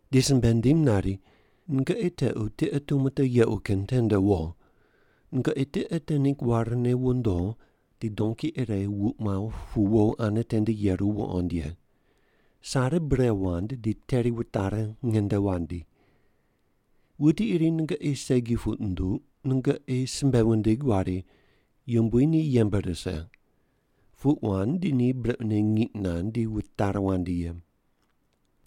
di simbe nindim nari, “Nungoqi tequ tiqe tumo te yequ kin tende wo. Nungoqi tiqe te ningg warne wondo di donki ire wuq muaw pu wo ane tende yeru wuqond ye. Sare bure wand di teri wutari nge nde wandi. Wuti iri nungoqi segi puq nunduq, nungoqi simbe wundig wari, ‘Yumbui ni yembe rise.’ Puq wand di ni brequne ngiq nand di wutari wandi ye.”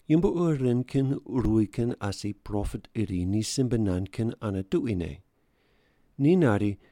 Yumbo ur ren kin ruwi kin asi propet iri ni simbe nand kin ane tuquine. Ni nari,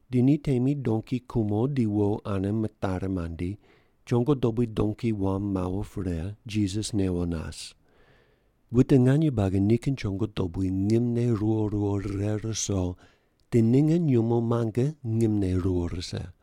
Di ni temi donki kumo di wo ane mitari mandi, chongo dobui donki wam mawo pre, Jisas newo nas. Wute nganye buagi nikin chongo dobui ngimne ruwo ruwo rire ruso di ninge nyumo muange ngimne ruwo rise.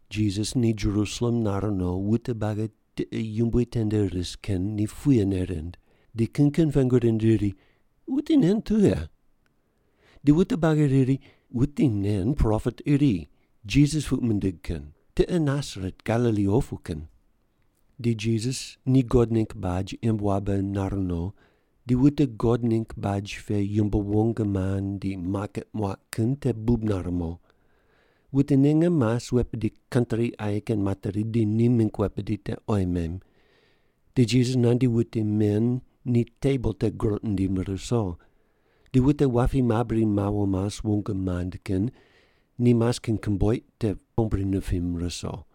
Jisas ni Jerusalem nar no, wute buagi tiqe yumbui tende ris kin ni puyene rind, ni kin kin pengu rind riri, “Wuti nen tughe?” Di wute buagi riri, “Wuti nen propet iri, Jisas puq mindig kin, tiqe Nasaret Galili opu kin.” Di Jisas ni God ningg baj imb wabe nar no, di wute God ningg baj pe yumbo wong mand di maket muaq kin te bub nare mo. Wute ninge mas wet bidi kantri aye kin materi di ni mingg wet bidi te oyi mem. Di Jisas nandi wute men ni tebol te groq nindim ruso, di wute wapi mabri mawo mas wong mand kin ni mas kin komboiq te pombri nipim ruso.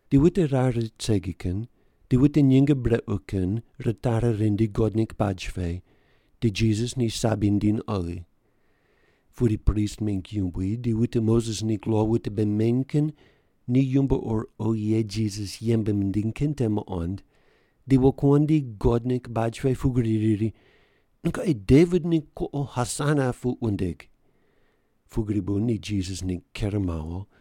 Di wute rar rit segi kin di wute nyinge brequ kin ritari rindi God ningg baj pe, di Jisas ni sabi nindiny oghi. Pudi prist mingg yumbui di wute Moses ningg lo wute bei meny kin ni yumbo ur oghi ye Jisas yembe nindiny kin te muqond, di wokuandi God ningg baj pe pugri riri, “Nungoqi Devit ningg kuqo Hosana puq wundig!” Pugri bu ni Jisas ningg ker mawo,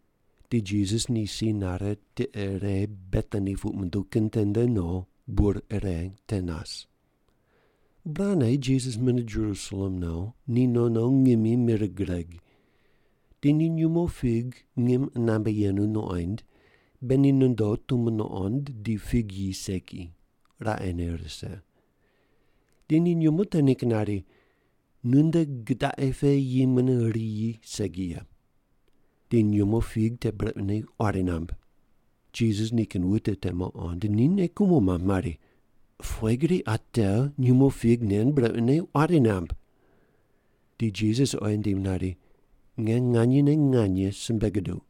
Di Jisas ni si nare, tiqe ire Betani puq munduw kin tende no, bur ire te nas. Burane Jisas mune Jerusalem no, ni no no ngimi mir gureg. Di ni nyumo fig ngim qunambe yenu nuqoind, be ni nondo tumo nuqond di fig yi segi, raqene rise. Di ni nyumo te ningg nari, “Nunde gidaqi pe yi mune riyi segi ye!” Di nyumo fig te brequne quari namb. Jisas nikin wute te muqond, ni nei kumo mamb mari, “Pughe gri ate nyumo fig nen brequne quari namb?” Di Jisas oyi nindim nari, “Nge nganyene nganye simbe guduq,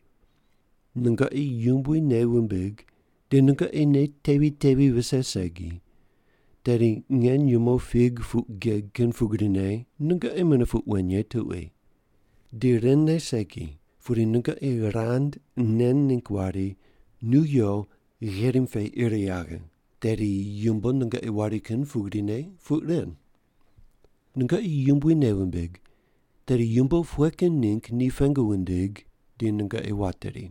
nungoqi Yumbui nei wumbig di nungoqi nei tevi tevi vise segi, tedi nge nyumo fig puq geg kin pugrine nungoqi mune puq wen ye tuqui. Di ren ne segi, pudi nungoqi rand nen ningg wari, ‘Nu yo gherim pe ir yaghe,’ tedi yumbo nungoqi wari kin pugrine puq ren. Nungoqi Yumbui nei wumbig, tedi yumbo pughe kin ningg ni pengu wundig di nungoqi wateri.”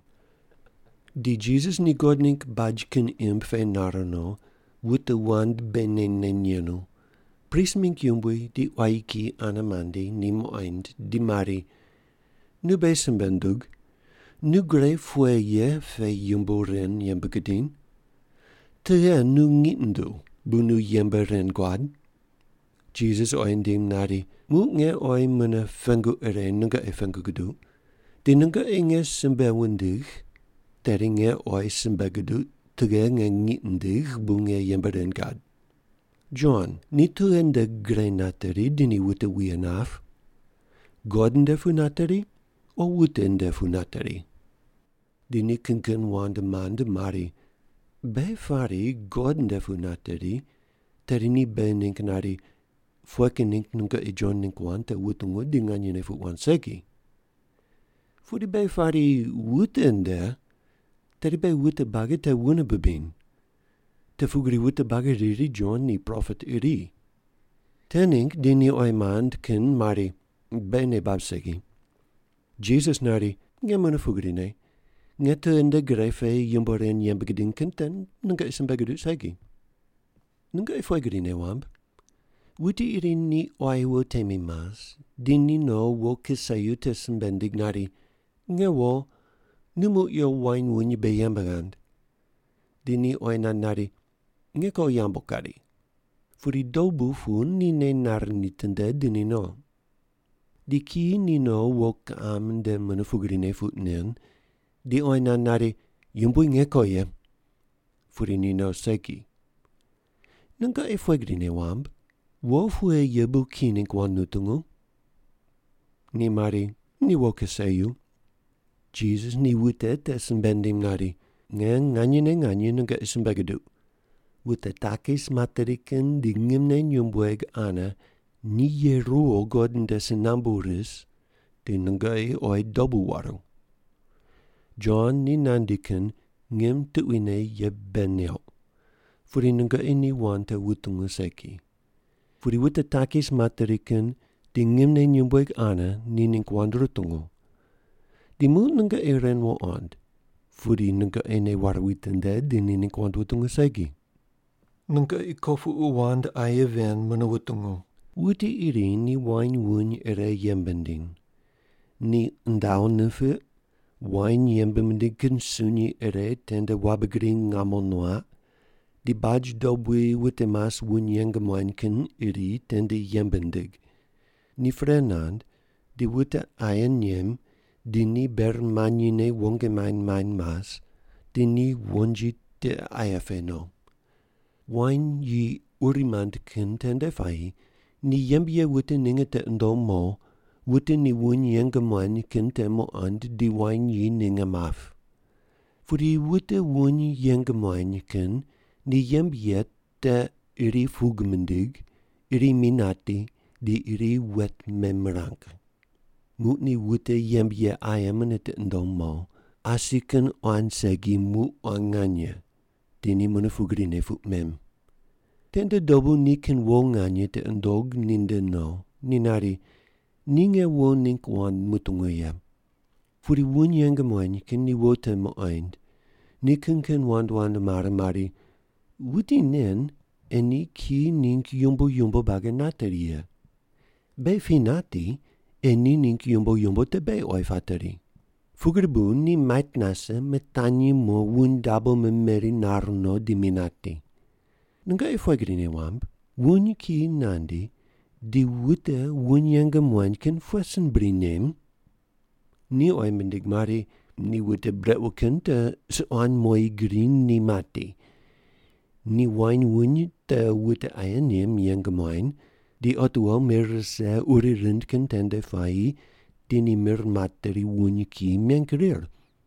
Di Jisas ni God ningg baj kin imb pe nar no, wute wand bei neny neny yenu, prist mingg yumbui di quayi kiyi ane mandi ni muqoind di mari, “Nu beghi simbe ndug, nu gre pughe ye pe yumbo ren yembe gudiny? Tughe nu ngiq nunduw bu nu yembe ren guad?” Jisas oyi nindim nari, “Muq nge oyi mune pengu ire nungoqi pengu guduq, di nungoqi nge simbe wundigh tedi nge oyi simbe guduq tughe nge ngiq nindigh bu nge yembe ren gad. Jon ni tughe nde gre nateri di ni wute wuye nap? God nde pu nateri o wute nde pu nateri.” Di ni kin kin wand mand mari, “Beghi pari God nde pu nateri, tedi ni beghi ningg nari, ‘Pughe kin ningg nungoqi Jon ningg wand te wutungu di nganyene puq wand segi?’ Pudi beghi pari, ‘Wute nde,’ tedi beghi wute buagi te wune bibiny. Te pugri wute buagi riri Jon ni propet iri.” Te ningg di ni oyi mand kin mari, “Beghi nei bab segi.” Jisas nari, “Nge mune pugrine, nge tughe nde gre pe yumbo ren yembe gidiny kin te nungoqi simbe guduq segi.” “Nungoqi pughe gri nei wamb? Wuti iri ni quayi wo temi mas, di ni no wo kiseyu te simbe nindig nari, ‘Nge wo, nu muq yo wain wuny mbe yembe ghand.’ Di ni oyi nand nari, ‘Nge ko yambu kari.’ Pudi dobu pu ni nei nare nitinde di ni no. Di kiyi ni no wo kiqam nde te mune pugrine puq nen, di oyi nand nari, ‘Yumbui, nge ko ye.’ Pudi ni no segi. Nungoqi pughe gri nei wamb, wo pughe ye bu kiyi ningg wand nutungu?” Ni mari, “Ni wo kiseyu.” Jisas ni wute te simbe nindim nari, “Nge nganyene nganye nungoqi simbe guduq, wute takis materi kin di ngimne nyumbueg ane ni ye ruwo God nde si nambu ris di nungoqi oyi dobu waru. Jon ni nandi kin ngim tuquine ye bei neuq, pudi nungoqi ni wand te wutungu segi. Pudi wute takis materi kin di ngimne nyumbueg ane ni ningg wand rutungu. Di muq nungoqi ren wuqond, pudi nungoqi nei ware witinde di ni ningg wand wutungu segi.” “Nungoqi kopuqu wand aye ven mune wutungu. Wuti iri ni wain wuny ire yembe nindiny. Ni undaw nipiq, wain yembe mindig kin sunyi ire tende wabe gri ngamo nuaq, di baj dobui wute mas wuny yeng muany kin iri tende yembe nindig. Ni pre nand di wute aye nem di ni ber manyine wong maind maind mas, di ni wonji tiqe aye pe no. Wain yi uri mand kin tende puayi ni yembe ye wute ninge tiqi nundom mo, wute ni wuny yeng muany kin te muqond di wain yi ninge map. Pudi wute wuny yeng muany kin ni yembe ye te iri pug mindig, iri mi nati, di iri wet memirang. Muq ni wute yembe ye aye mune tiqi nundom mo, asi kin quan segi muq quan nganye. Di ni mune pugrine puq mem. Tende dobu nikin wo nganye tiqi nundog ninde no, ni nari, ‘Ni nge wo ningg wand mutungu ye.’ Pudi wuny yeng muany kin ni wo te muqoind, ni kin kin wand wand mare mari, ‘Wuti nen ei ni kiyi ningg yumbo yumbo buagi nateri ye. Beghi pi nati, ei ni ningg yumbo yumbo te beghi oyi pateri.’ Pugri bu ni mait nase, mitanyi mo wuny dabo memeri nar no di mi nati. Nungoqi pughe gri nei wamb? Wuny kiyi nandi di wute wuny yeng muany kin pughe sin bri nem?” Ni oyi mindig mari, “Ni wute brequ kin te suquan moyi gri ni mati, di wain wuny te wute aye nem yeng muany, di otiwo mir rise uri rind kin tende puayi di ni mir materi wuny kiyi meng rir.”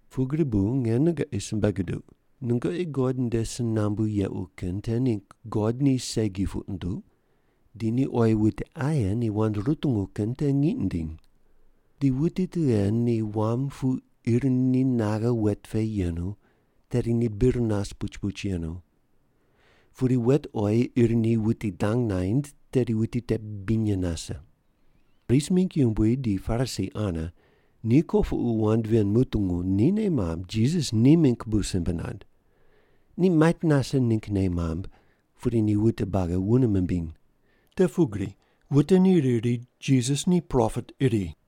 “Pugri bu nge nungoqi simbe guduq, nungoqi God nde si nambu yequ kin te ningg God ni segi puq nunduq, di ni oyi wute aye ni wand rutungu kin te ngiq nindiny. Di wuti tughe ni wam pu ir ni naghe wet pe yenu, tedi ni bir nas puch puch yenu. Pudi wet oyi ir ni wuti dang naind, tedi wuti te binye nase.” Prist mingg yumbui di Parisi ane ni kopuqu wand ven mutungu, ni nei mamb Jisas ni mingg bu simbe nand. Ni mait nase ningg nei mamb, pudi ni wute buagi wune mimbiny. Te pugri wute ni riri Jisas ni propet iri.